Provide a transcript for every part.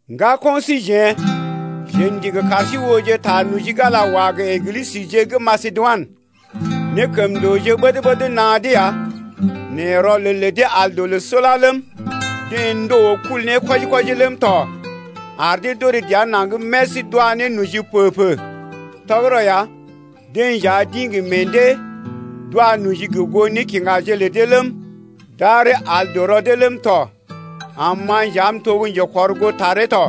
Ŋgako̰ síjeḛ, jeḛ ndigi kar sí ooje ta noji gə́ Ala wa gə Eglisəje gə́ Masedoinə. Nékəmndooje ɓəd-ɓəd naa dee ya nɛ rɔlel lə dee al dɔ loo sula ləm, deḛ ndòo kul ne kwɔji-kwɔji ləm tɔ ar dee d’orè dəa naŋg mès d’wa ne noji pə-pə. Tɔgərɔ ya, deḛ nja d’ḭ gə meḛ dee d’wa noji gə goo nékiŋgaje lə dee ləm, d’aree al dɔ rɔ dee ləm tɔ, am ma nja m’to gə́ njekɔrgootaree tɔ.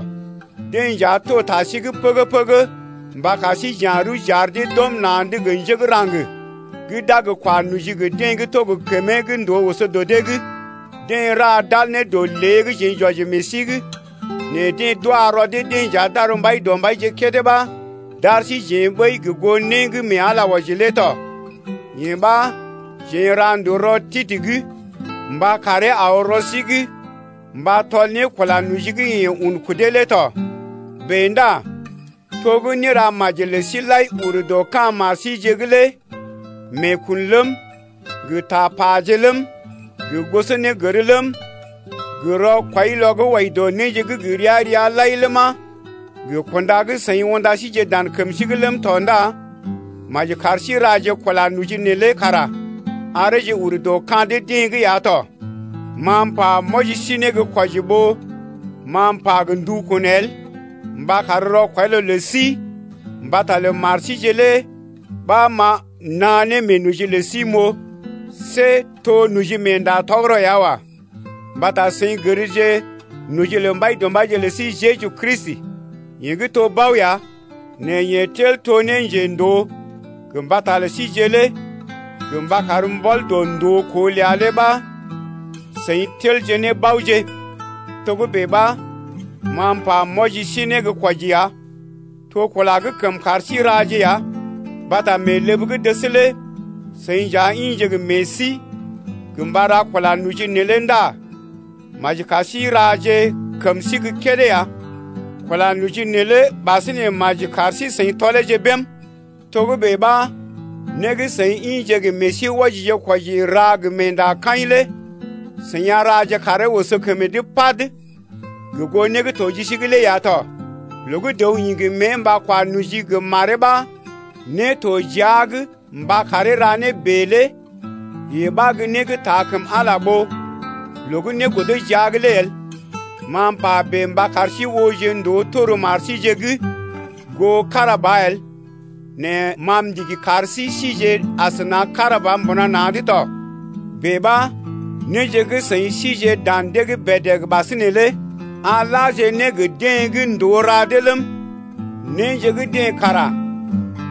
Deḛ nja to ta sí’g pəgə-pəgə mba kar sí j’ya̰ rəw j’ar dee d’ɔm na̰’d gə njé gə́ raŋg gə́ d’a gə kwa noji gə deḛ gə́ to gə kəmee gə́ ndòo oso dɔ dee’g. Deḛ ra d’al ne dɔ lée gə́ jeḛ j’wɔji meḛ sí’g nɛ deḛ d’wa rɔ dee-deḛ nja d’ar Mbaidɔmbaije kédé ɓa d’ar síjeḛ ɓəi gə goo né gə́ mee Ala wɔji lé tɔ. Yee ɓa jeḛ n’ra ndòo rɔ Titə’g mba karee aw rɔ sí’g mba tɔl ne kula noji gə́ yeḛ un kudee lé tɔ. Bèe ndá to néramaji lə sí lai ur dɔ ka̰ mar síje’g lé meekun ləm, gə tapaje ləm, gə gosonégər ləm, gə rɔkwɔilɔ gə́ wɔji dɔ néje gə́ gə ria-ria lai ləma, gə kunda gə́ seḭ unda síjeḛ dan kəm sí’g ləm tɔ ndá kar sí raje kula noji neelé kara areeje urje ne dɔ ka̰ dee-deḛ’g ya tɔ. Ma m’pa m’wɔji sí ne gə́ kwɔji ɓó ma m’pa gə ndukun el mba kar rɔkwɔilɔ lə sí mbata lə mar síje lé ɓa ma m’naa ne meenoji lə sí m’oo see to nojimeenda tɔgərɔ ya wa. Mbata seḭ gərje noji lə Mbaidɔmbaije lə sí Jeju Kristi, yeḛ gə́ to bao ya nɛ yeḛ tel to njendoo gə mbata lə síje lé gə mba kar mbɔl dɔ ndookoo ləa lé ɓa seḭ telje ne baoje. Togə́bè ɓa, ma m’pa m’wɔji sí ne gə́ kwɔji ya. To kula gə́ kəm kar sí raje ya mbata mee ləb gə́ dəs lé seḭ nja ḭje gə meḛ sí gə mba ra kula noji neelé ndá maji kar sí raje kəm sí gə́ kédé ya. Kula noji neelé ɓasinè maji kar sí-seḭ tɔleeje bém. Togə́bè ɓa né gə́ seḭ ḭje gə meḛ sí wɔjije-kwɔji ra gə meendakaḭ lé seḭ a raje karee oso kəmee’g pad gə goo né gə́ to ji sí’g lé ya tɔ. Loo gə́ dəw ḭ gə mée mba kwa noji gə maree ɓa né to jia’g mba karee ra né bèe lé yee ɓa gə́ né gə́ taa kəm Ala ɓó loo gə́ né godo jia’g lé el. Ma m’pa bèe mba kar sí ooje ndòo tor mar síje’g goo kára ba el nɛ ma m’ndigi kar sí síje asəna kára ba mbuna na̰’d tɔ. Bèe ɓa néje gə́ seḭ sije dan dee’g bèdèg ɓasinè lé a laje ne gə deḛ gə́ ndòo ra dee ləm, néje gə́ dee kara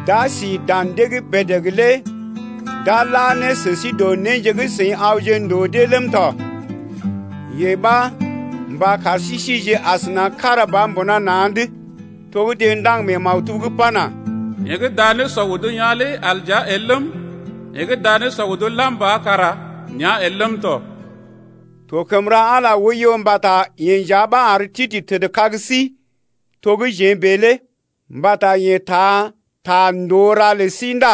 d’a si dan dee’g bèdèg lé d’a la ne sə sí dɔ néje gə́ seḭ awje ndòo dee ləm tɔ. Yee ɓa mba kar sí sije asəna kára ba mbuna na̰’d. To gə́ deḛ ndaŋg mee maktub’g pana: Yeḛ gə́ daa nésɔ odo yaa̰ lé al dəa el ləm, Yeḛ gə́ daa nésɔ odo lam ba kara nea el ləm tɔ. To kəm ra Ala oiyo mbata yeḛ nja ɓa ar Titə tədkag sí to gə́ jeḛ bèe lé mbata yeḛ taa ta ndòo ra lə sí ndá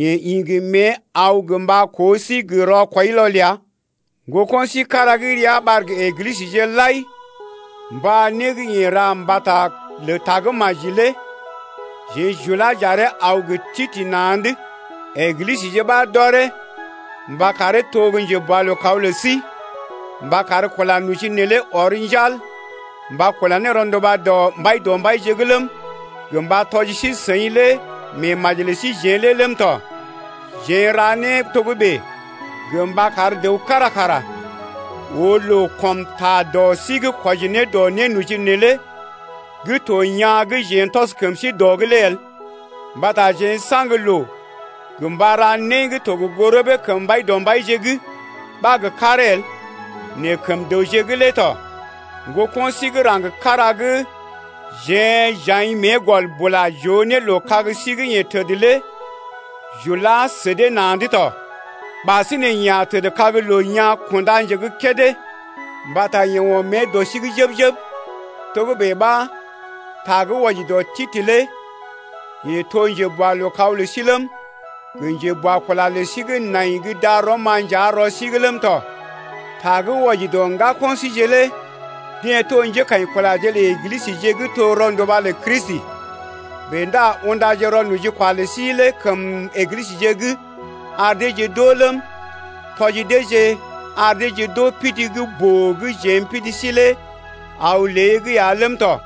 yeḛ ḭ gə mée aw gə mba koo sí gə rɔkwɔilɔ ləa. Ŋgoko̰ sí kára gə́ ria ɓar gə Eglisəje lai mba né gə́ yeḛ ra mbata lə Tagə́maji lé jeḛ j’ulá j’aree aw gə Titə na̰’d. Eglisəje ɓa d’ɔree mba karee to gə́ njeboalookaw lə sí, mba kar kula noji neelé ɔr njal mba kula ne rɔnduba dɔ Mbaidɔmbaije’g ləm, gə mba tɔji sí-seḭ lé meemaji lə síjeḛ lé ləm tɔ. Jeḛ n’ra né togə́bè gə mba kar dəw kára kara oo loo kɔm ta dɔ sí’g kwɔji ne dɔ nénoji neelé gə́ to yaa̰ gə́ jeḛ n’tɔs kəm sí dɔ’g lé. Mbata jeḛ n’saŋg loo gə mba ra né gə́ to gə goo rəbee kəm Mbaidɔmbaije’g ɓa gə karee el nɛ kəm dəwje’g lé tɔ. Ŋgoko̰ sí gə́ raŋg kára gə́ jeḛ j’aḭ mée gɔl bula j’oo ne loo kag sí gə́ yeḛ təd lé j’ulá sə dee na̰’d tɔ, ɓasinè yeḛ a tədkag loo yaa̰ kunda nje gə́ kédé mbata yeḛ ɔm mée dɔ sí’g jəb-jəb. Togə́bè ɓa, ta gə́ wɔji dɔ Titə lé yeḛ to njeboalookaw lə sí ləm, gə njeboakula lə sí gə́ nai gə́ darɔm-ma nja rɔ sí’g ləm tɔ. Ta gə́ wɔji dɔ ŋgako̰ síje lé deḛ to njékaḭkulaje lə Eglisəje gə́ to rɔnduba lə Kristi. Bèe ndá undaje rɔ nojikwa lə sí lé kəm Eglisəje’g ar deeje d’oo ləm, tɔji deeje ar deeje d’oo pidi gə́ boo gə́ jeḛ m’pidi sí lé aw lée’g ya ləm tɔ.